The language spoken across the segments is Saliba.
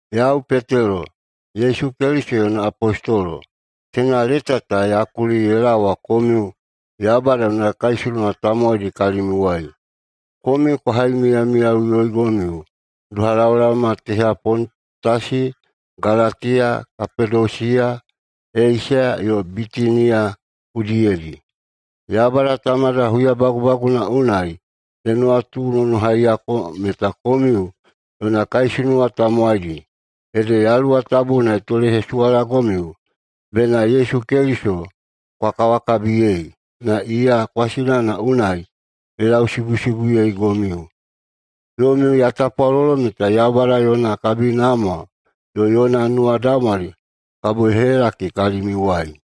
Yau Petelo, Yesu Keliso yona apostolo. Teina leta ta ya kuli ye laowa komiu Yaubada yona kaisunuwa tamowaidi kalimiuwai. Komiu kwa haimiyamiyaigomiu doha laolaoma teha Pontasi, Galatiya, Kapadosiya, Eisiya yo Bitiniya udiyedi. Yaubada Tamada huyabagubaguna unai ye nuwatunonohaiyako meta komiu yona kaisunuwa tamowaidi, ede Yaluwa Tabuna ye tolehesuwalagomiu bena Yesu Keliso kwa kawakabiyei, na iya kwasinana unai ye lausibusibuyeigomiu. Yomiu ya tapwalolo meta Yaubada yona kabinamwa yo yona nuwadaumwali kabo ye helakidi kalimiuwai.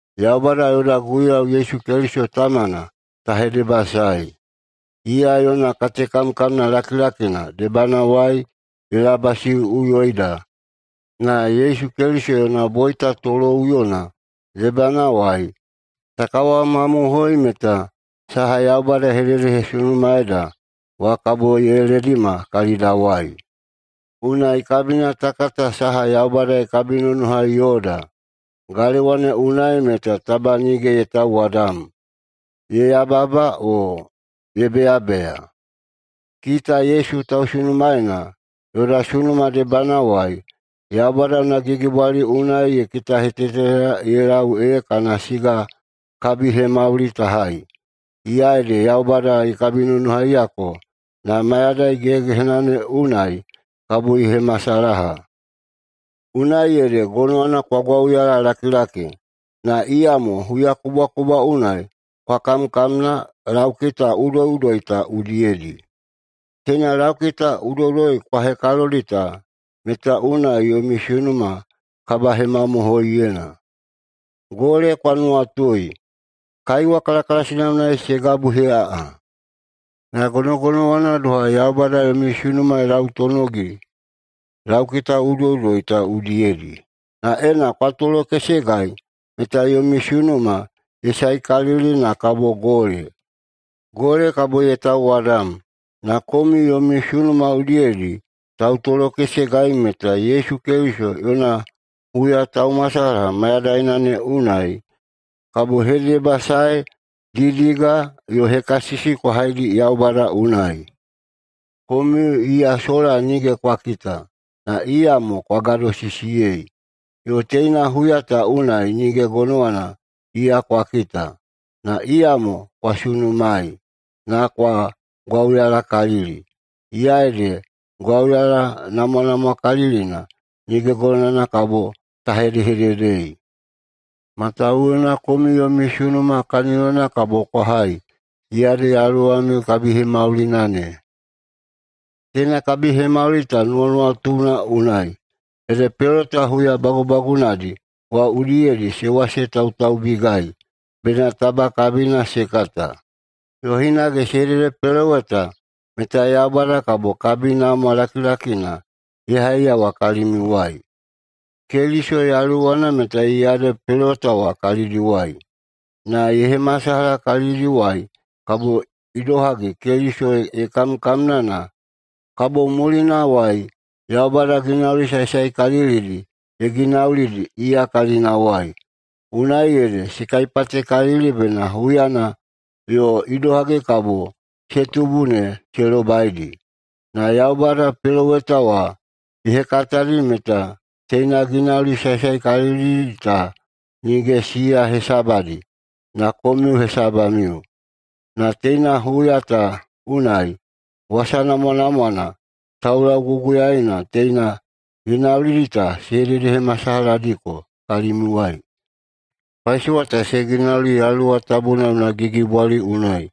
Yaubada yoda Guiyau Yesu Keliso Tamana ta hedebasaei! Iya yona katekamkamna lakilakina debanawai ye labasiꞌuyoida na Yesu Keliso yona boita toloꞌuyona debanawai ta kawamamohoi meta saha Yaubada ye hededehesunumaeida wa kabo ye ledima kalidawai. Unai kabina ta kata saha Yaubada ye kabinonohai yoda, galewa ne unai meta taba nige ye tauwadam, ye yababa, o ye beyabeya. Kita Yesu tausunumaena yoda sunuma debanawai, Yaubada yona gigibwali unai ye kitaheteteda ye lau ee kana siga kabihemauli ta hai. Iya ede Yaubada ye kabinonohaiyako na mayadai gehegehena ne unai kabo ye hemasalaha. Unai ede gonowana kwa gwauyalalakilaki, na iyamo huyakubwakubwa unai kwa kamkamna laukita udoiꞌudoi ta udiyedi. Teina laukita udoiꞌudoi kwa hekalodi ta meta unai yomi sunuma kabahemamohoiyena. Gole kwa nuwatui! Kaiwa kalakalasina unai se gabuheꞌaꞌa. Na gonogonowana doha Yaubada yomi sunuma ye lautonogi laukita udoiꞌudoi ta udiyedi. Na ena kwa tolokesegai meta yomi sunuma ye saekalili na kabo gole. Gole kabo ye tauwadam, na komiu yomi sunuma udiyedi tautolokesegai meta Yesu Keliso yona huyataumasalaha mayadaina ne unai kabo hedebasae, didiga yo hekasisi kwa haidi Yaubada unai. Komiu iya sola nige kwa kita, na iyamo kwa gadosisiyei. Yo teina huya ta unai nige gonowana iya kwa kita, na iyamo kwa sunumaei, na kwa gwauyalakalili. Iya ede gwauyala namwanamwakalilina nige gonowana kabo ta hedehededei. Matawuwuna komiu yomi sunuma kaniyona kabo kwa hai, iya ede yaluwamiu kabihemaulina ne. Teina kabihemauli ta nuwanuwatuna unai, ede peloweta huya bagubagunadi wa udiyedi se wasetautaubigai bena taba kabina se kata. Yo hinage se hededepeloweta meta Yaubada kabo kabinamwa lakilakina ye haiyawa kalimiuwai. Keliso Yaluwana meta iya ede peloweta wa kalidiwai, na ye hemasalaha kalidiwai kabo idohagi Keliso ye kamkamna na kabo mulinawai Yaubada ginauli saesaekalilidi ye ginaulidi iya kalinawai. Unai ede se kaipatekalili bena huyana yo idohagi kabo se tubu ne se lobaidi. Na Yaubada peloweta wa ye hekatadi meta teina ginauli saesaekalilidi ta nige siya hesabadi, na komiu hesabamiu. Na teina huya ta unai wasa namwanamwana taulauguguyaena teina ginaulidi ta se hededehemasalahadiko kalimiuwai. Paisowa ta se ginauli Yaluwa Tabuna yona gigibwali unai,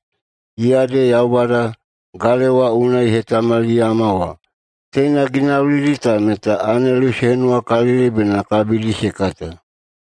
iya ede Yaubada galewa unai ye hetamaliyama wa. Teina ginaulidi ta meta anelu se henuwakalili bena kabidi se kata.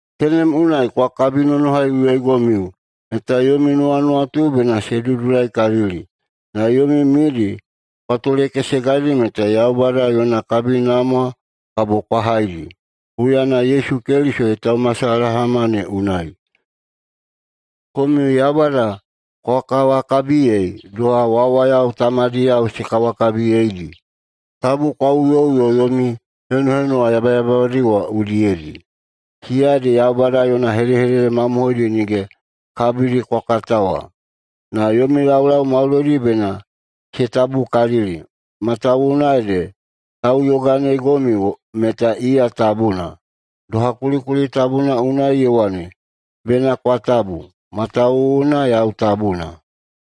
Tenem unai kwa kabinonohaiꞌuyoigomiu meta yomi nuwanuwatu bena se dudulaikalili, na yomi midi kwa tolekesegaidi meta Yaubada yona kabinamwa kabo kwa haidi, huyana Yesu Keliso yona taumasalahama ne unai. Komiu Yaubada kwa kawakabiyei doha wawayao tamadiyao se kawakabiyeidi, tabu kwa uyoꞌuyo yomi henuhenuwa yabayababadi wa udiyedi. Siya ede Yaubada yona hedehedede mamohoidi nige kabidi kwa kata wa. Na yomi laulau maudoidi bena se tabukalili, matawuwuna ede tauyoganeigomiu meta iya tabuna. Doha kulikuli tabuna unai ye wane, “Bena kwa tabu, matawuwuna yau tabuna”.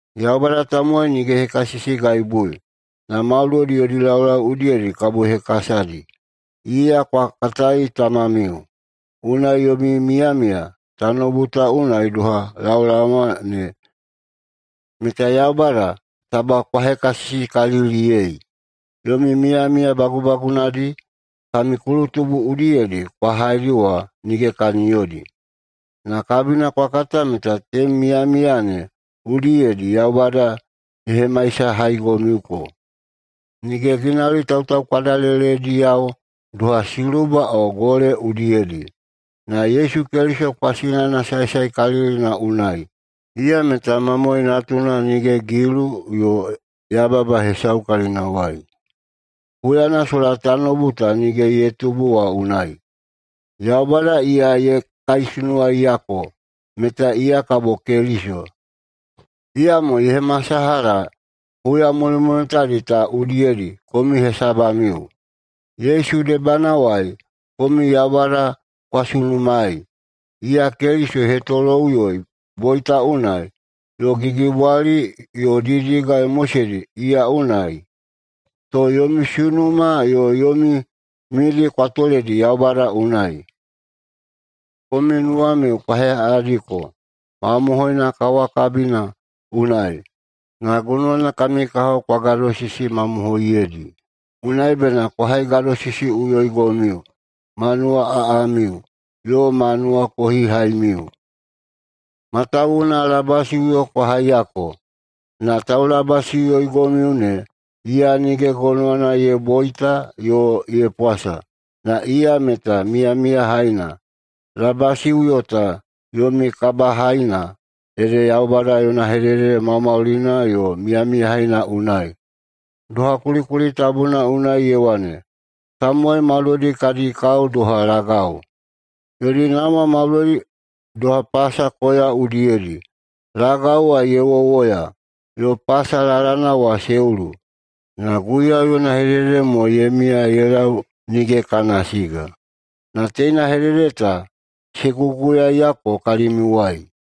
Yaubada tamowai nige ye hekasisigaibui, na maudoidi yodi laulau udiyedi kabo ye hekasadi. Iya kwa katai Tamamiu. Unai yomi miyamiya tanoubu ta unai doha laolaoma ne meta Yaubada taba kwa hekasisikaliliyei. Yomi miyamiya bagubagunadi kami kulutubu udiyedi kwa haidi wa nige kaniyodi. Na kabina kwa kata meta tenem miyamiya ne udiyedi Yaubada ye hemaisahaigomiuko nige ginauli tautaukwadalelediyao doha siluba o gole udiyedi, na Yesu Keliso kwasinana saesaekalilina unai. Iya meta mamoe natuna nige gilu yo yababa hesau kalinawai. Huyana sola tanoubu ta nige ye tubu wa unai, Yaubada iya ye kaisunuwaiyako meta iya kabo Keliso, iyamo ye hemasalaha huya mulimulitadi ta udiyedi komiu hesabamiu. Yesu debanawai komiu Yaubada kwa sunumaei. Iya Keliso ye hetoloꞌuyoi boita unai, yo gigibwali yo didiga ye moseidi iya unai, to yomi sunuma yo yomi midi kwa toledi Yaubada unai. Komiu nuwamiu kwa heꞌaꞌadiko mamohoina kawakabina unai, na gonowana kami kahao kwa gadosisimamohoiyedi. Unai bena kwa haigadosisiꞌuyoigomiu ma nuwaꞌaꞌamiu yo ma nuwakohihaimiu. Matawuwuna labasiꞌuyo kwa haiyako, na taulabasiꞌuyoigomiu ne, iya nige gonowana ye boita yo ye pwasa, na iya meta miyamiyahaina. Labasiꞌuyo ta yomi kabahaina ede Yaubada yona hedehedede maumaulina yo miyamiyahaina unai. Doha kulikuli tabuna unai ye wane, Tamowai maudoidi kadi kao doha lagau, yodi namwa maudoidi doha pasa koya udiyedi. Lagau wa ye wowoya, yo pasa lalana wa se ulu. Na Guiyau yona hedehedede mo ye miya ye lau nige kana siga. Na teina hedehedede ta se guguyaeyako kalimiuwai.